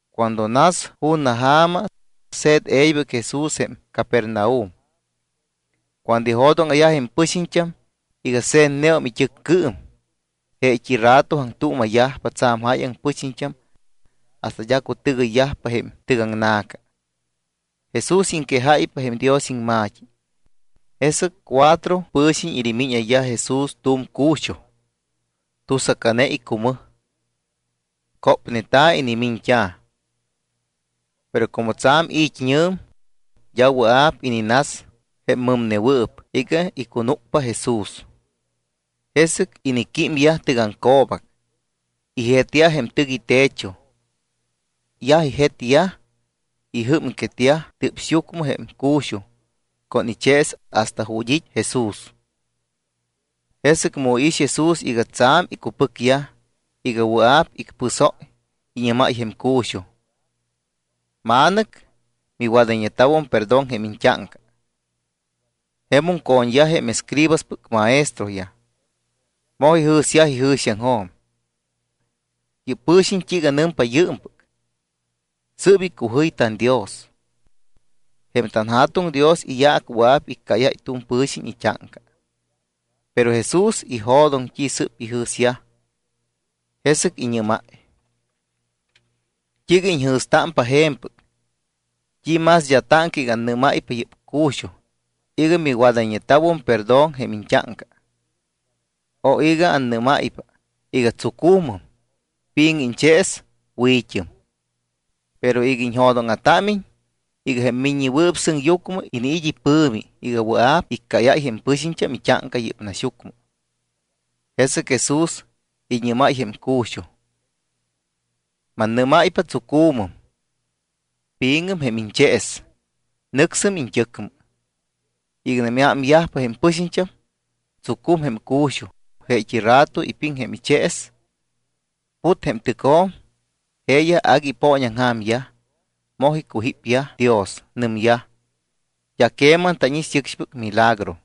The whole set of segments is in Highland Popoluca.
Cuando nas ju̱na ja̱ma, se̱t e̱ybɨc Jesús jém Capernaum. Cuando ijo̱dóŋa̱yaj jém pɨxiñt́am iga se̱tneum it́ɨccɨɨm, jeet́i rato aŋtuuma̱yajpa tsa̱m jáyaŋ pɨxiñt́am hasta d́a cutɨgɨyyajpa jém tɨgaŋna̱ca. Jesús iŋquejáypa jém Dios iŋma̱t́i. Jesɨc cuatro pɨ̱xiñ inimíñayyaj Jesús tu̱m cu̱xuj tusacane icumɨj. Cópneta̱ inimiñt́a̱. Pero como tsa̱m it́ñɨ̱m, d́a wɨa̱p ininas jém mɨmnewɨɨp iga icunúcpa Jesús. Jesɨc iniquímyaj tɨgaŋco̱bac, ijetyaj jém tɨc itecho. Yaj ijetyaj, ijɨ́mquetyaj tɨ́psyucmɨ jém cu̱xuj con ichees hasta ju̱t́ it́ Jesús. Jesɨc mu iix Jesús iga tsa̱m icupɨcyaj iga wɨa̱p icpɨsóy, iñɨ́máy jém cu̱xuj: —Ma̱nɨc, miwadayñeta̱ perdón jém iñt́áŋca. Jemum co̱ñyaj jém escribaspɨc maestroyaj. Moj ijɨ̱syaj ijɨ̱xiaŋjo̱m: “¿Yɨ́p pɨ̱xiñ t́iiga nɨmpa yɨɨmpɨc? Sɨ́p icujɨy tanDios. Jém tanJa̱tuŋ Dios iyaac wɨa̱p iccáyáy tu̱m pɨ̱xiñ it́áŋca.” Pero Jesús ijo̱doŋ t́i sɨ́p ijɨ̱syaj, jesɨc iñɨ́máy: —¿T́iiga iñjɨ̱stámpa je̱mpɨc? ¿T́i más d́a táŋca iga annɨ́máypa yɨ́p cu̱xuj iga “Miwadayñeta̱ perdón jém iñt́áŋca” o iga annɨ́máypa iga: “Tsucu̱mɨm, pi̱ŋɨm iñchees, wi̱t́ɨm?” Pero iga iñjo̱dóŋa̱támiñ iga jém Miññewɨɨp Sɨŋyucmɨ iniit́ ipɨ̱mi iga wɨa̱p iccáyáy jém pɨxiñt́am it́áŋca yɨ́p naxyucmɨ (jesɨc Jesús iñɨ́máy jém cu̱xuj): Mannɨ́máypa, tsucu̱mɨm, pi̱ŋɨm jém iñchees, nɨcsɨm iñt́ɨcmɨ. Iganam iámyajpa jém pɨxiñt́am, tsucum jém cu̱xuj, jeet́i rato ipiŋ jém ichees, put jém tɨcjo̱m. Jeeyaj agui ipooñaŋja̱myaj, moj icujípyaj Dios. Nɨmyaj: —D́a queman tánix yɨcxpɨc milagro.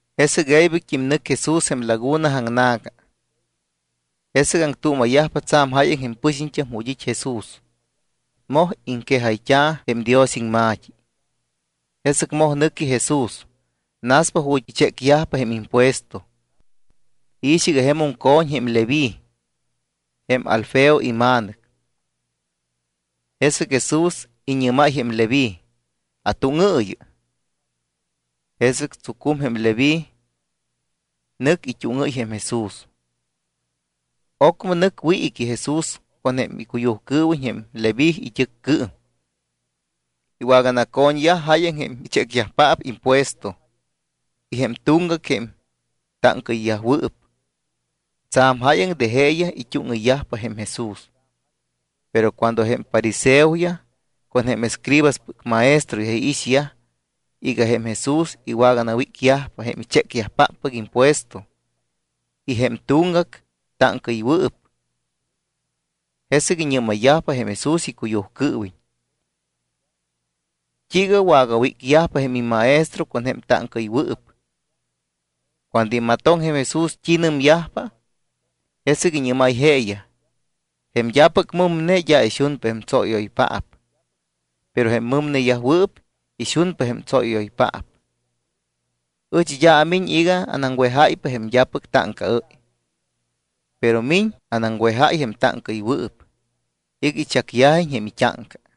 Jesɨc e̱ybɨc nɨc Jesús jém laguna aŋna̱ca. Jesɨc aŋtuuma̱yajpa tsa̱m jáyaŋ jém pɨxiñt́am ju̱t́ it́ Jesús. Moj iŋquejayyajta̱ jém Dios iŋma̱t́i. Jesɨc moj nɨqui Jesús, naspa ju̱t́ ichécyajpa jém impuesto. Iix iga jemum co̱ñ jém Leví, jém Alfeo ima̱nɨc. Jesɨc Jesús iñɨ́máy jém Leví: —Atúŋɨɨyɨ. Jesɨc tsucum jém Leví, nɨc it́úŋɨ́y jém Jesús. Ocmɨ nɨc wiiqui Jesús con icuyujcɨɨwiñ jém Leví it́ɨccɨɨm. Iwaganaco̱ñyaj jáyaŋ jém ichécyajpaap impuesto y jém tuŋgac jém táŋcaɨyyajwɨɨp. Tsa̱m jáyaŋ de jeeyaj it́úŋɨyyajpa jém Jesús. Pero cuando jém fariseoyaj con jém escribaspɨc maestroyaj iixyaj iga jém Jesús iwaganawícyajpa jém ichécyajpáppɨc impuesto y jém tuŋgac táŋcaɨywɨɨp, jesɨc iñɨ́mayyajpa jém Jesús icuyujcɨɨwiñ: —¿T́iiga wagawícyajpa jém immaestro con jém táŋcaɨywɨɨp? Cuando imatoŋ jém Jesús t́i nɨmyajpa, jesɨc iñɨ́máy jeeyaj: —Jém d́apɨc mɨmne d́a ixunpa jém tsóyɨ́yoypaap, pero jém mɨmneyajwɨɨp ixunpa jém tsóyɨ́yoypaap. Ɨch d́a amiñ iga anaŋwejáypa jém d́apɨc táŋcaɨ́y, pero miñ anaŋwejáy jém táŋcaɨywɨɨp iga ichacyajiñ jém it́áŋca.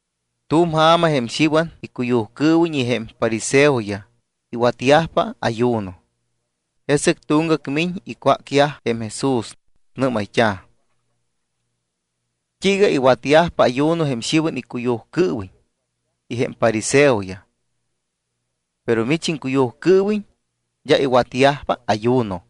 Tu̱m ja̱ma jém Xiwan icuyujcɨɨwiñ y jém fariseoyaj iwatyajpa ayuno. Jesɨc tuŋgac miñ icwácyaj jém Jesús, nɨ́mayt́a̱: —¿T́iiga iwatyajpa ayuno jém Xiwan icuyujcɨɨwiñ y jém fariseoyaj, pero mich iŋcuyujcɨɨwiñ d́a iwatyajpa ayuno?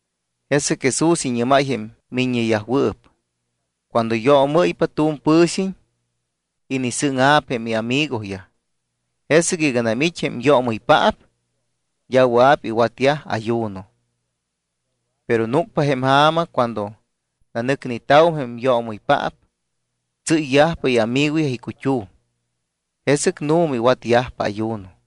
Jesɨc Jesús iñɨ́máy jém miññeyajwɨɨp: —Cuando yoomɨ́ypa tu̱m pɨ̱xiñ, inisɨ́ŋa̱p jém iamigoyaj. Jesɨc iganam it́ jém yoomɨypaap, d́a wɨa̱p iwatyaj ayuno. Pero núcpa jém ja̱ma cuando nanɨcneta̱wum jém yoomɨypaap, tsɨ́yyajpa iamigoyaj icut́um. Jesɨc nu̱ma iwatyajpa ayuno.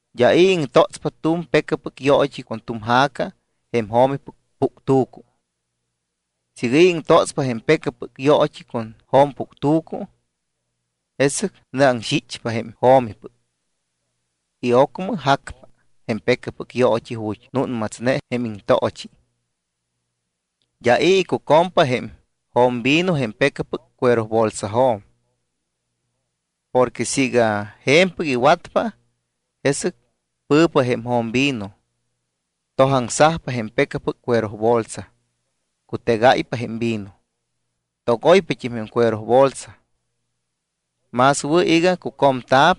’D́a i̱ iŋtótspa tu̱m pecapɨc yoot́i con tu̱m ja̱ca jém jo̱mipɨc puctu̱cu. Siiga i̱ iŋtótspa jém pecapɨc yoot́i con jo̱mpuctu̱cu, jesɨc nɨaŋxichpa jém jo̱mipɨc y ocmɨm jacpa jém pecapɨc yoot́i ju̱t́ núnmatsne jém iŋtoochi. D́a i̱ icucompa jém jo̱mvino jém pecapɨc cuerobolsajo̱m. Porque siiga je̱mpɨc iŋwatpa, jesɨc pɨ̱pa jém jo̱mvino, tojaŋsajpa jém pecapɨc cuerobolsa, cutegáypa jém vino, togoypat́im jém cuerobolsa. Más wɨ̱ iga cucomta̱p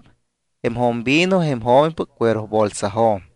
jém jo̱mvino jém jo̱mipɨc cuerobolsajo̱m.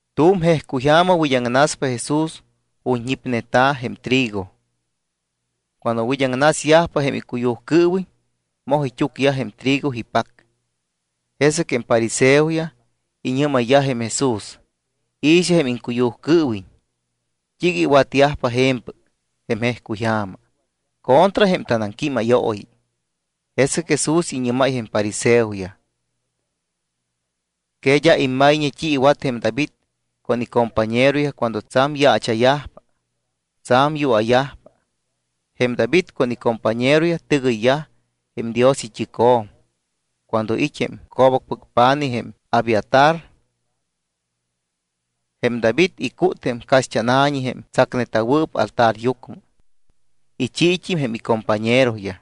Tu̱m jejcuy ja̱ma wid́aŋnaspa Jesús ju̱t́ ñipneta̱ jém trigo. Cuando wid́aŋnasyajpa jém icuyujcɨɨwiñ, moj it́úcyaj jém trigo ipac. Jesɨc jém fariseoyaj iñɨ́mayyaj jém Jesús: —I̱xɨ jém iŋcuyujcɨɨwiñ, ¿t́iiga iwatyajpa je̱mpɨc jém jejcuyja̱ma contra jém tanaŋquímayooyi? Jesɨc Jesús iñɨ́máy jém fariseoyaj: —¿Que d́a immayñe t́i iwatyaj jém David con icompañeroyaj cuando tsa̱m yaacha̱yajpa, tsa̱m yua̱yajpa? Jém David con icompañeroyaj tɨgɨyyaj jém Dios it́ɨcjo̱m cuando it́ jém co̱bacpɨc pa̱nij jém Abiatar. Jém David icút jém caxt́ána̱ñi jém tsacneta̱wɨɨp altaryucmɨ. Ichiit́im jém icompañeroyaj.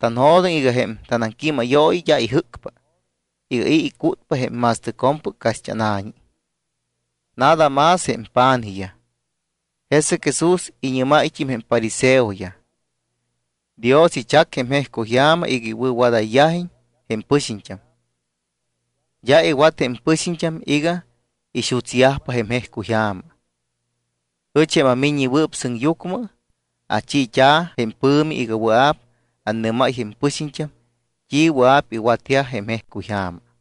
Tanjo̱doŋ iga jém tanaŋquímayooyi d́a ijɨ́cpa iga i̱ icútpa jém ma̱stɨcjo̱mpɨc caxt́ána̱ñi, nada más jém pa̱nijyaj. Jesɨc Jesús iñɨ́máyt́im jém fariseoyaj: —Dios ichac jém jejcuy ja̱ma iga iwɨ̱wadayyajiñ jém pɨxiñt́am. D́a iwat jém pɨxiñt́am iga ixutsyajpa jém jejcuy ja̱ma. Ɨch, jém aMiññewɨɨp Sɨŋyucmɨ, achiit́a̱ jém pɨ̱mi iga wɨa̱p annɨ́máy jém pɨxiñt́am t́i wɨa̱p iwatyaj jém jejcuyja̱ma.